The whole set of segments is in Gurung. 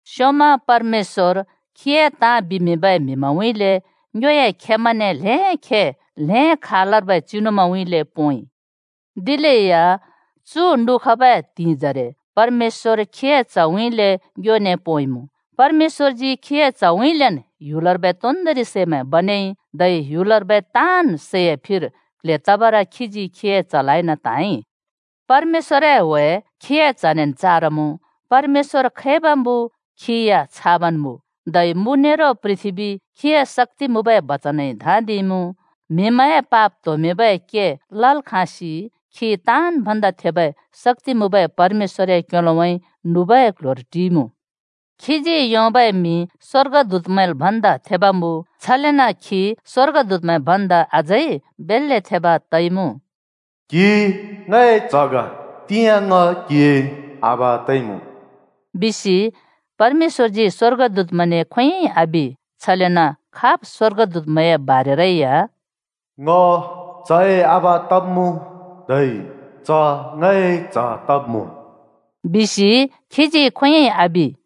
स्‍योंमा परमेश्‍वर खीए ताँ बिमिंबै म्हिमैंउँइँले ङ्योए खेमैंने ल्‍हें खे, ल्हें खालर्बै चिनुमैंउँइँले पोंइ। दिलेया चु नुखबै त्हिंइजरे परमेश्‍वर खीए च्‍हउँइँले ङ्योने पोंइमुँ। परमेश्‍वरजी खीए च्हउँइँलेन् ह्‍युलर्बै तोन्दोंरि सैमैं बनेइ। धै ह्‍युलर्बै ताँन् सैए फिर क्ल्हे तबर खीजी खीए च्‍हलाइन त्हाँइ। परमेश्‍वरए ह्‍वे खीए च्हनेन् चारमुँ, परमेश्‍वर खैब मुँ खी या छाबन् मुँ। धै मु नेरो पृथ्‍बी खीए शक्‍ति मुँबै बचनइ धाँदिइमुँ। म्‍हिमैंए पाप त्होमिंबै के लल् खाँसि खी ताँन् भन्दा थेबै शक्‍ति मुँबै परमेश्‍वरए क्‍योलोउँइँ नुबै क्ल्ह्‍योर टिइमुँ। खीजी योंबै मिं स्‍वर्गदूतमैंल् भन्दा थेब मुँ। छलेन खी स्वर्गदूतमैं भन्दा अझै बेल्‍ले थेब तइमुँ। “क्हि ङए च्‍ह ग, तिंयाँ ङ क्‍हिए आबा तइमुँ” बिसि परमेश्‍वरजी स्वर्गदूतमैंने खोंयोंइ आबि, छलेन खाब् स्वर्गदूतए बारेरै या “ङ चए आबा तब्मुँ, धै च ङए च्ह तब्मुँ,” बिसि खीजी खोंयोंइ आबि।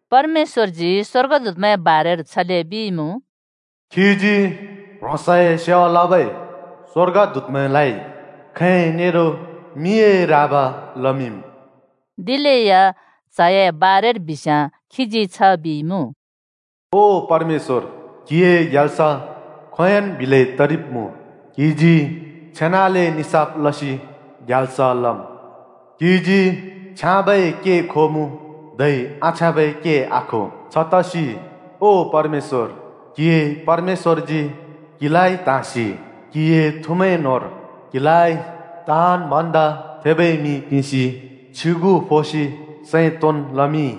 परमेश्‍वरजी स्‍वर्गदूतमैंए बारेर छले बिइमुँ: “खीजी ह्रोंसए सेवा लबै स्वर्गदूतमैंलाइ खैं नेरो मिए राब लमिंम्।” दिलेया च्‍हए बारेर बिस्‍याँ खीजी छ बिइमुँ, “ओ परमेश्‍वर, क्‍हिए ग्याल्स खोंयोंन् बिलै तरिब्‍मुँ। क्‍हिजी छेनाले निसाफ लसि ग्याल्स लम्। क्‍हिजी छ्याँबै के खोमुँ, धै आछ्याँबै के आखो। छतसि ओ परमेश्‍वर, क्‍हिए परमेश्‍वरजी क्‍हिलाइ त्हाँसि क्हिए थुमैं न्होंर क्हिलाइ ताँन् भन्दा थेबै मिं पिंसि छ्युगु फोसि सैं तोंन् लमिंइ।”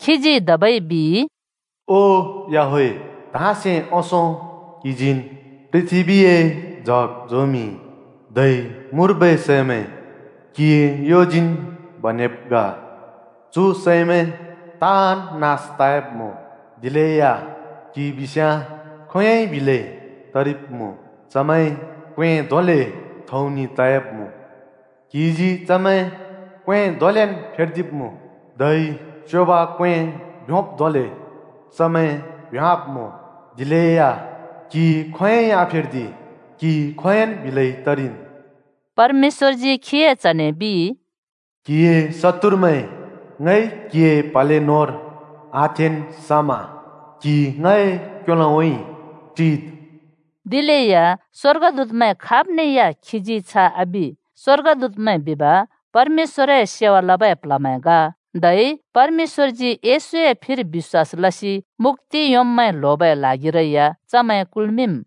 खीजी धबै बिइ, “ओ याहवेह, धाँसे ओंसों क्हिजीन् पृथ्‍बीए जग झोंमिंइ, धै मुर्बै सैमैं क्हिए योजीन् बनेब् ग। चु सैमैं ताँन् नास तयाब्‍मुँ, दिलेया क्हि बिस्याँ खोंयोंइ बिलै तरिब्‍मुँ। चमैं क्‍वें धोंले थौंनि तयाब्‍मुँ, क्हिजी चमैं क्‍वें धोंलेन् फेर्दिब्‍मुँ, धै स्योब क्वें भ्योंब् धोंले चमैं भ्योंवाब्मुँ। दिलेया क्हि खोंयोंइ आफेर्दि, क्‍हि खोंयोंन् बिलै तरिम्।” परमेश्‍वरजी खीए च्‍हने बिइ, “क्‍हिए शत्तुरमैं ङइ क्‍हिए प्‍हले न्‍होंर आथेंन् समा, क्‍हि ङए क्‍योलोउँइँ टिद्।” दिलेया स्‍वर्गदूतमैं खाबने या खीजी छ आबि। स्‍वर्गदूतमैं बिब, परमेश्‍वरए सेवा लबै प्ल्हमैं ग। धै परमेश्‍वरजी येशूए फिर बिश्‍वास लसि मुक्‍ति योंब्मैं ल्होबै ल्हागिरै या चमै कुल्‍मिंम्।